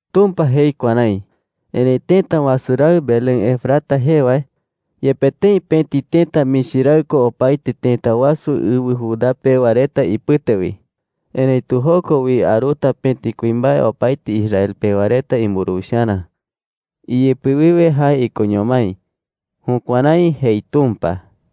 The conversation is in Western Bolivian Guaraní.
Tumpa jei kuärái: “Erëi tëta wasu raɨ Belén Efrata jee wae, yepe tëi pëti tëta michi raɨ ko opaete tëta wasu ɨwɨ Judá pewa reta ipɨte wi, erëitu joko wi aruta pëti kuimbae opaete Israel pewa reta imburuwicharä. Iyɨpɨ wiwe jae ikoño mái.” Jukuärái jei Tumpa.